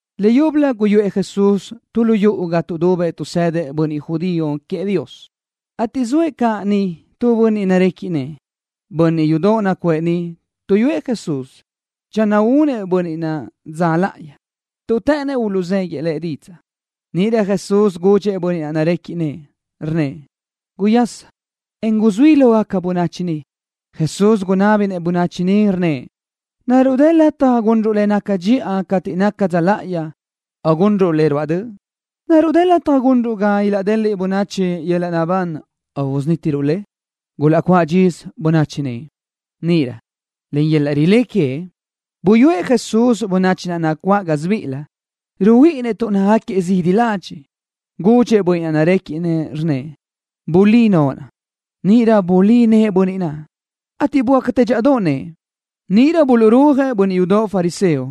Leyúbölö guyuʼë Jesús tu lu yuʼu ga tuʼdubëʼ tuʼsëdëʼ bönniʼ judío queëʼ Dios, ateʼ zoëʼ caʼ niʼ tu bönniʼ narequiʼ nëʼë. Bönniʼ yudoʼ nacuʼë niʼ tuʼyúëʼ Jesús channö únëʼ bönniʼ naʼ dza láʼayi, tuʼ të́ʼënnëʼ uluʼzéguiʼë Lëʼ didzaʼ. Níʼirö Jesús gudxëʼ bönniʼ naʼ narequiʼ nëʼë, rnnëʼ: —Guyasa, en guzuí lógaca bönachi ni. Jesús gunábinëʼ bönachi niʼ, rnnëʼ: —¿Naruʼ dë lataj gunruʼ le naca dxiʼa cateʼ naca dza láʼayi o gunruʼ le ruáʼ döʼ? ¿Naruʼ dë lataj gunruʼ ga ilaʼdeliʼ bönachi yöl-laʼ naʼbán o usunítiruʼ le? Gulaʼcuáʼ dxisö bönachi niʼ. Níʼirö len yöl-laʼ rilé queëʼ, buyúëʼ Jesús bönachi naʼ nacuáʼ gásibiʼilëʼ. Ruhuíʼinnëʼ tuʼ nácagaquiëʼ zidi ladxiʼ. Gudxëʼ bönniʼ naʼ narequiʼ nëʼë, rnnëʼ: —Bulí noʼo. Níʼirö bulí nëʼë bönniʼ naʼ, ateʼ böácatë dxíʼadoʼ nëʼë. Níʼirö buluʼrúajëʼ bönniʼ yudoʼ fariseo,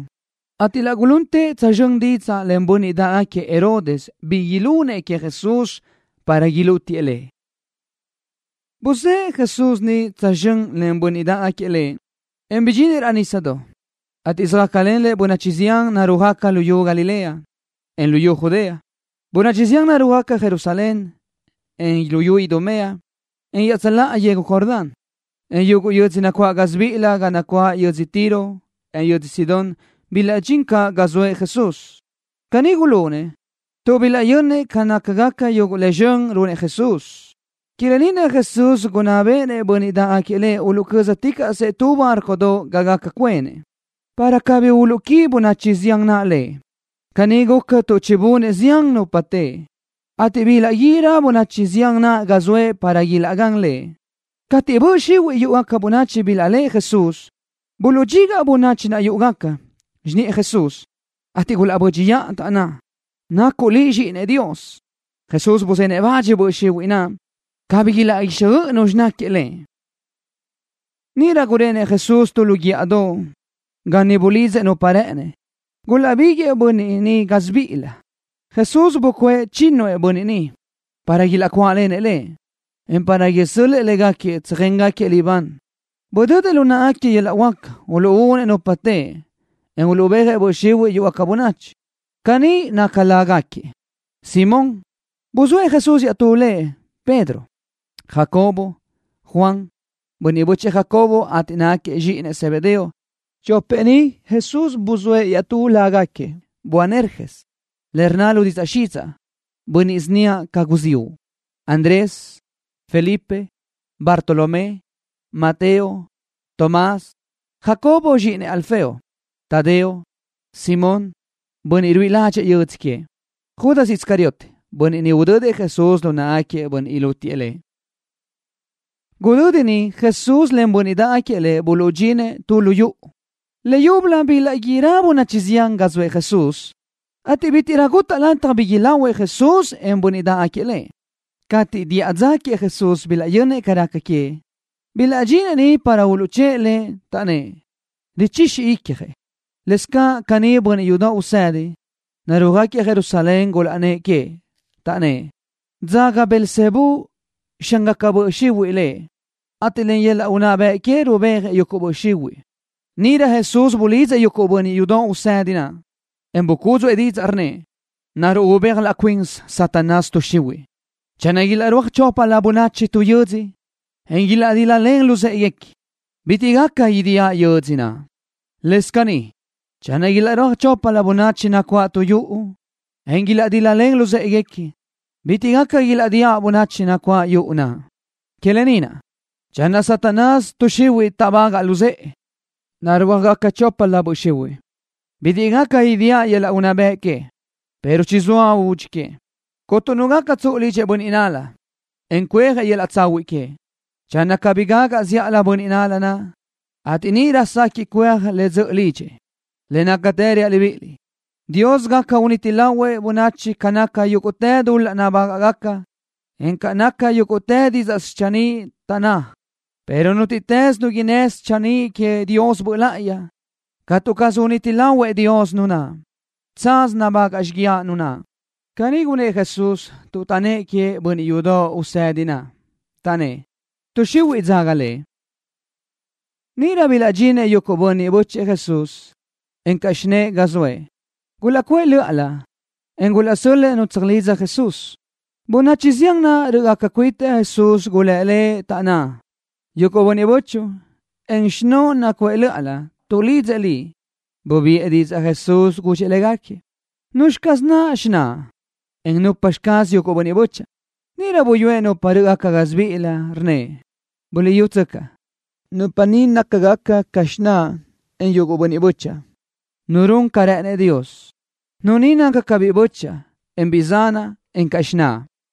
ateʼ laʼ guluntëʼ tsözxö́n didzaʼ len bönniʼ dáʼgaquiëʼ Herodes bi ilunëʼ queëʼ Jesús, para ilútiëʼ Lëʼ. Buzë́ʼë Jesús niʼ tsözxö́n len bönniʼ dáʼgaquiëʼ Lëʼ, en bidxinëʼ raʼ nísadoʼ, ateʼ söjácalen Lëʼ bönachi zián narúajgaca luyú Galilea, en luyú Judea. Bönachi zián narúajgaca Jerusalén, en luyú Idumea, en iaʼtsöláʼa yegu Jordán, en yuguʼ yödzö nacuáʼ idú gásibiʼilö ga nacuáʼ yödzö Tiro, en yödzö Sidón bilaʼdxín caʼ ga zoëʼ Jesús. Caní gulunëʼ, tuʼ bilaʼyönnëʼ ca nácagaca yuguʼ le zxön runëʼ Jesús. Que lë ni naʼ Jesús gunná béʼenëʼ bönniʼ dáʼgaquiëʼ Lëʼ uluʼcö́zticaʼsëʼ tu bárcodoʼ ga gaca cuenëʼ, para cabí uluʼquí bönachi zián naʼ Lëʼ. Caní guca tuʼ chibunëʼ zián nupa teʼe, ateʼ bilaʼguírö bönachi zián naʼ ga zoëʼ para ilaʼgán Lëʼ. Cateʼ böʼ xihuiʼ yúʼugaca bönachi bilaʼléʼe Jesús, buluʼdxigaʼ bönachi naʼ yúʼugaca xiniʼë Jesús, ateʼ gulaʼbö́dxiʼa, taʼnná: —Nacuʼ Liʼ Zxíʼinëʼ Dios. Jesús buzenëʼ le bach böʼ xihuiʼ naʼ, cabí ilaʼguixjöʼ nu náquiëʼ Lëʼ. Níʼirö gurenëʼ Jesús tu lu guíʼadoʼ, ga niʼ bulidzëʼ nupa rë́ʼënëʼ. Gulaʼbiguëʼë bönniʼ ni gásibiʼilëʼ. Jesús bucuʼë chínnuëʼ bönniʼ ni, para ilaʼcuáʼlenëʼ Lëʼ, en para isö́l-lëʼë légaquiëʼ tsöjéngaquiëʼ libán. Budödëʼ lu náʼagaquiëʼ yöl-laʼ huáca uluʼúnëʼ nupa teʼe, en uluʼbéajëʼ böʼ xihuiʼ yúʼugaca bönachi. Caní nácagaca lágaquiëʼ: Simón, (buzóëʼ Jesús iaʼtú lëʼ, Pedro), Jacobo, Juan, (bönniʼ bö́chëʼë Jacobo, ateʼ nácagaquiëʼ zxíʼinëʼ Zebedeo. Chopëʼ ni, Jesús buzóëʼ iaʼtú lágaquiëʼ, Boanerges, le rnna lu didzaʼ xidzaʼ: Bönniʼ síniaʼ ca guziúʼ), Andrés, Felipe, Bartolomé, Mateo, Tomás, Jacobo, (zxíʼinëʼ Alfeo), Tadeo, Simón, (bönniʼ ruíʼi ládxëʼë yödzö queëʼ), Judas Iscariote, (bönniʼ udödëʼ Jesús lu náʼagaquiëʼ bönniʼ ilútiëʼ Lëʼ). Gudödi niʼ Jesús len bönniʼ dáʼgaquiëʼ Lëʼ buluʼdxinëʼ tu lu yuʼu. Leyúbölö bilaʼguírö bönachi zián ga zoëʼ Jesús, ateʼ bítiʼrö gutaʼ lataj bi ilahuëʼ Jesús, en bönniʼ naʼ dáʼgaquiëʼ Lëʼ. Cateʼ diʼa dza queëʼ Jesús bilaʼyönnëʼ ca raca queëʼ, bilaʼdxinëʼ niʼ para uluʼchë́ʼë Lëʼ, taʼnnë́ʼ: Richixi icjëʼ. Lëscaʼ caní bönniʼ yudoʼ usedi, narúajgaquiëʼ Jerusalén gulaʼnnë́ʼ queëʼ, taʼnnë́ʼ: —Dzaga Belzebú, xángaca böʼ xihuiʼ Lëʼ, ateʼ len yöl-laʼ unná bëʼ que rubéajëʼ yuguʼ böʼ xihuiʼ. Níʼirö Jesús bulidzëʼ yuguʼ bönniʼ yudoʼ usedi naʼ, en bucúdzuʼë didzaʼ, rnnëʼ: —¿Naruʼ ubéaj laʼ cuinsi Satanás tuʼ xihuiʼ? Channö ilaʼrúaj choplö bönachi tu yödzö, en ilaʼdíl-lalen luzë́ʼeguequi, bitiʼ gaca idíaʼ yödzö naʼ. Lëscaʼ caní channö ilaʼrúaj choplö bönachi nacuáʼ tu yuʼu, en ilaʼdíl-lalen luzë́ʼeguequi, bitiʼ gaca ilaʼdíaʼ bönachi nacuáʼ yuʼu naʼ. Que lë ni naʼ, channö Satanás tuʼ xihuiʼ táʼbagaʼ luzë́ʼe, narúajgaca choplö böʼ xihuiʼ. Bitiʼ gaca idíaʼ yöl-laʼ unná bëʼ que, pero chizóa údxi que. ’Cuntu nu gaca tsuʼu lidxëʼ tu bönniʼ nál-la, en cuéaj yöl-laʼ tsahuiʼ queëʼ channö cabí gagaʼ zíʼalö bönniʼ nál-la naʼ, ateʼ níʼirö sequiʼ cuéaj le dzöʼö lidxëʼ. ’Le nácatë reaʼ libíʼiliʼ: Dios gaca uniti lahuëʼ bönachi ca naca yúguʼtë dul-laʼ nabágaʼgaca, en ca naca yúguʼtë didzaʼ schanníʼ taʼnná, pero nútiʼtës nu innë́ schanníʼ queëʼ Dios Böʼ Láʼayi, catu caz uniti lahuëʼ Dios nu naʼ. Tsaz nabagaʼ xíguiaʼ nu naʼ. Caní gunnë́ʼ Jesús tuʼ taʼnnë́ʼ queëʼ bönniʼ yudoʼ usedi naʼ, taʼnnë́ʼ: —Tuʼ xihuiʼ dzaga Lëʼ. Níʼirö bilaʼdxinëʼ yuguʼ bönniʼ bö́chëʼë Jesús, encaʼ xinë́ʼë ga zoëʼ. Gulaʼcuʼë lö́ʼalö, en gulaʼsö́l-lëʼë nu tsöjlidza Jesús. Bönachi zián naʼ rö́ʼgaca cuitëʼ Jesús gulë́ Lëʼ, taʼnná: —Yuguʼ bönniʼ bö́chuʼu, encaʼ xinóʼo nacuʼë lö́ʼalö, tuʼlidzëʼ Liʼ. Bubiʼë didzaʼ Jesús, gudxëʼ légaquiëʼ: —¿Nuzxi caz naʼ xináʼa, en nupxi caz yuguʼ bönniʼ bö́chaʼa? Níʼirö buyúëʼ nupa naʼ rö́ʼgaca gásibiʼilëʼ, rnnëʼ: —Buliʼyútsöcaʼ. Nupa ni nácagaca ca xináʼa, en yuguʼ bönniʼ bö́chaʼa. Nu run ca rë́ʼënëʼ Dios, nu ni naca ca biʼi bö́chaʼa, en biʼi zanaʼ encaʼ xináʼa.